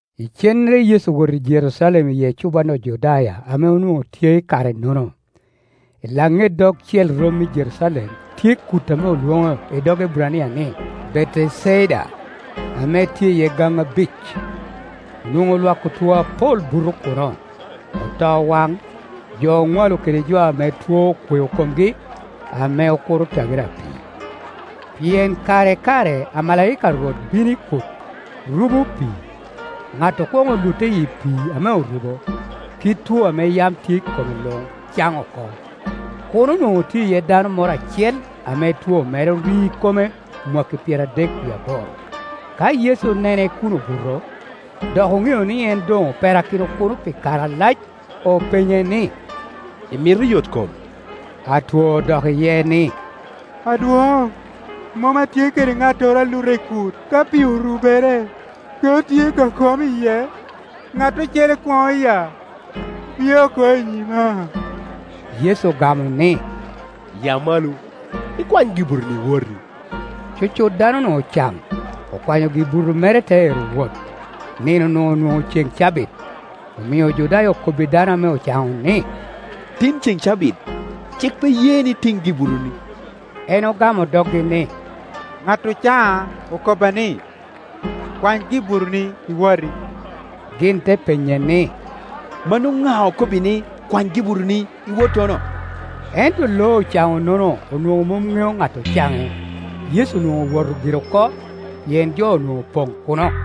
Icennere Yecu owoto i Jerucalem i ecuban Ojudaya ame onwoŋo tye i kare-nono. I laŋet dogcel romi i Jerucalem tye kut ame olwoŋo i dog Eburania ni, Beteceda, ame tye iye gaŋo abic. Onwoŋo lwak otwo apol buto kuno, otowaŋ, jo oŋwalo kede jo ame two okweo komgi, [ame okuro tagere a pii. Pien kare i kare amalaika a Rwot bino i kut, rubo pii. Ŋat okwoŋo lutte i pii ame orubo, kit two ame yam tye i kome luŋ caŋ oko.] Kuno onwoŋo tye iye dano moro acel ame two mere ori kome mwakki pyeradek wie aboro. Ka Yecu onene kun obuto, dok oŋeo ni en doŋ operakino kuno pi kare alac, openye ni, “Imito yotkom?” Atwo odok iye ni, “Adwoŋ, mom atye kede ŋattoro a luta i kut ka pii orubere. Ka atye ka komo iye, ŋat ocele kwoŋo ya, pye oko i nyima.” Yecu ogamo ni, “Ya malo, ikwany gi-butoni, iwoti.” Cucut dano-nu ocaŋ; okwanyo gi-buto mere te ero wot. Nino-nu onwoŋo ceŋ cabit, omio Ojudaya okobbi dano ame ocaŋo ni, “Tin ceŋ cabit, cik pe ye ni itiŋ gibutoni.” En ogamo doggi ni, ŋat ocaŋa okobba ni, “Kwany gi-butoni, iwoti.” Gin te penye ni, “Mano ŋa okobbi ni, ‘Kwany gi-butoni, iwot’ tono?” Ento lo ocano-nono onwoŋo mom ŋeo ŋat ocaŋe. Yecu onwoŋo owoto gire oko, pien jo onwoŋo opoŋ kuno.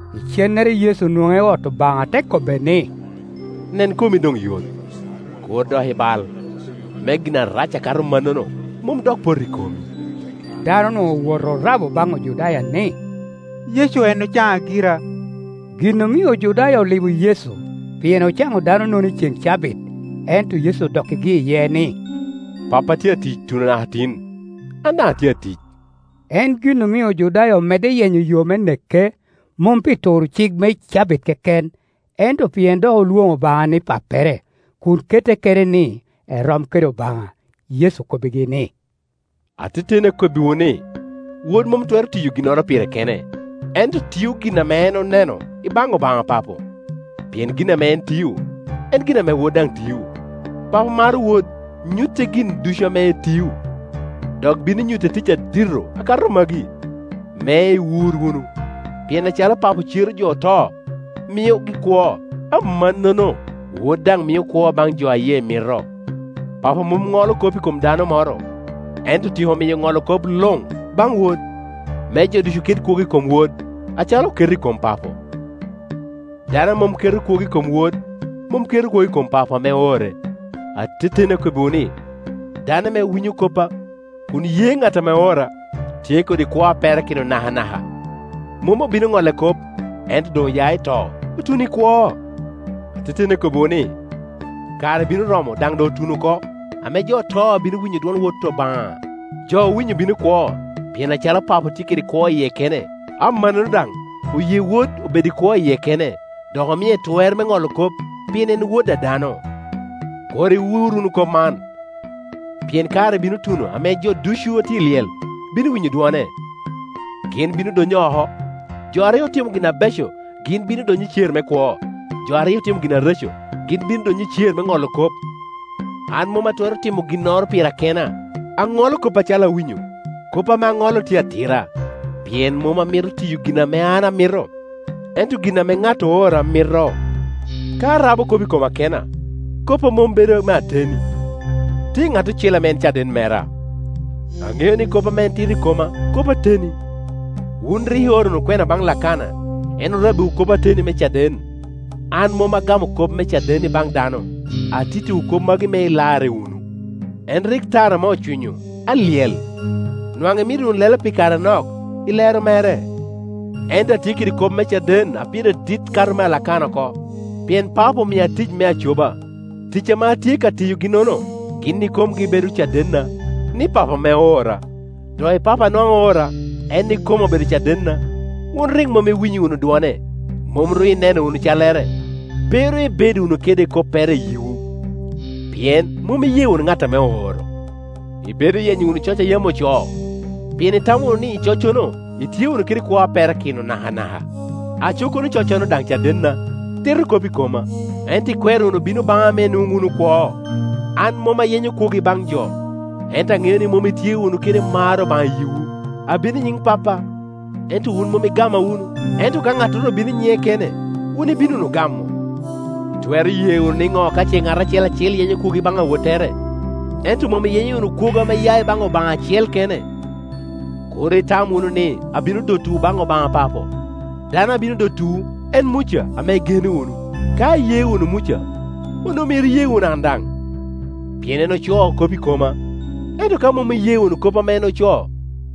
Icennere Yecu onwoŋe i ot Obaŋa te kobbe ni, “Nen, komi doŋ yot. Kur dok ibal, me gin arac akato mannono mom dok pot i komi.” Danonu owoto orabo baŋ Ojudaya ni, “Yecu en ocaŋa gira.” Gin omio Ojudaya olibo Yecu, pien ocaŋo danonono i ceŋ cabit. Ento Yecu odokkigi iye ni, “Pappa tye atic tuno naka tin, an daŋ atye atic.” En gin omio Ojudaya omedde yenyo yo me neke, mom pi turo cik me cabit keken, ento pien dok olwoŋo Obaŋa ni pappere, kun kette kene ni erom kede Obaŋa. Yecu okobbigi ni, “Ateteni akobbiwu ni, Wod mom twero tiyo ginnoro pire kene, ento tio gin ame en oneno i baŋ Obaŋa Papo; pien gin ame en tio, en gin ame Wod daŋ tio. Papo maro Wod, nyutte gin ducu ame etio; dok bino nyutte tic adito akato magi, me iwur wunu. Pien acalo Papo cero jo oto, miogi kwo, amannono Wod daŋ mio kwo baŋ jo a yie mito. Papo mom ŋolo kop i kom dano moro, ento otyeko miyo ŋolo kop luŋ baŋ Wod, me jo ducu ket kwogo i kom Wod, acalo oketo i kom Papo. Dano a mom keto kwogo i kom Wod, mom keto kwogo i kom Papo ame oore. Ateteni akobbiwu ni, dano ame winyo koppa, kun ye ŋat ame oora, tye kede kwo a perakino nakanaka; mom obino ŋolle kop, ento doŋ oya i to, otuno i kwo. “Ateteni akobbiwu ni, kare bino romo, daŋ doŋ otuno oko, ame jo oto bino winyo dwon Wot Obaŋa; jo owinyo bino kwo. Pien acalo Papo tye kede kwo i yie kene, amannono daŋ oye Wod obed i kwo i yie kene, dok omie twer me ŋolo kop, pien en Wod a dano. Kur iwur wunu kop man, pien kare bino tuno ame jo ducu a tye i lyel bino winyo dwone, gin bino donyo oko. Jo a rik otimo gin abeco gin bino donyo i cer me kwo, jo a rik otimo gin areco gin bino donyo i cer me ŋolo kop. “An mom atwero timo ginnoro pira kena; aŋolo kop acalo awinyo; kop ame aŋolo tye atira, pien mom amito tiyo gin ame an amito, ento gin ame ŋat oora mito. Ka arabo kop i koma kena, koppa mom bedo me ateni. Tye ŋat ocele ame en caden mera; aŋeo ni kop ame en tito i koma kop ateni. Wun rik ioro wunu kwena baŋ Lakana, en orabbiwu kop ateni me caden. An mom agamo kop me caden i baŋ dano, atittiwu kop magi me ilarre wunu. En rik tara ame ocwinyo, alyel, nwaŋ imito wunu lelo pi kare anok i lero mere. Ento atye kede kop me caden a pire dit kato mea Lakana oko; pien Papo omia tic me acoba, tic ame atye ka tiyogi-nono, gin ikomgi bedo cadenna, ni Papo ame oora. Doki Papo a nwaŋ oora, en ikome obedo cadenna. Wun rik mom iwinyo wunu dwone, mom ru ineno wunu callere; pe ru ibedo wunu kede koppere i yiwu, pien mom iye wunu ŋat ame ooro. Ibedo yenyo wunu coc a yam ocoo, pien itamo wunu ni, i coccono itye wunu kede kwo a perakino nakanaka. Aco kono coccono daŋ cadenna, tito kop i koma; ento ikwero wunu bino baŋa me inwoŋ wunu kwo. An mom ayenyo kwogo ibaŋ jo. Ento aŋeo ni mom itye wunu kede mar Obaŋa i yiwu. Abino i nyiŋ Pappa, ento wun mom igama wunu. Ento ka ŋattoro obino i nyiŋe kene, wun ibino wunu gamo. Itwero ye wunu niŋo ka ce ŋat acel acel yenyo kwogo i baŋ awottere, ento mom iyenyo wunu kwogo ame ya i baŋ Obaŋa acel kene? Kur itam wunu ni abino dotowu baŋ Obaŋa Papo; dano abino dotowu en Muca, ame igeno wunu. Ka iye wunu Muca, onwoŋo myero iye wunu an daŋ, pien en ocoo kop i koma. Ento ka mom iye wunu kop ame en ocoo,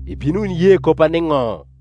ibino wunu ye koppa nino?”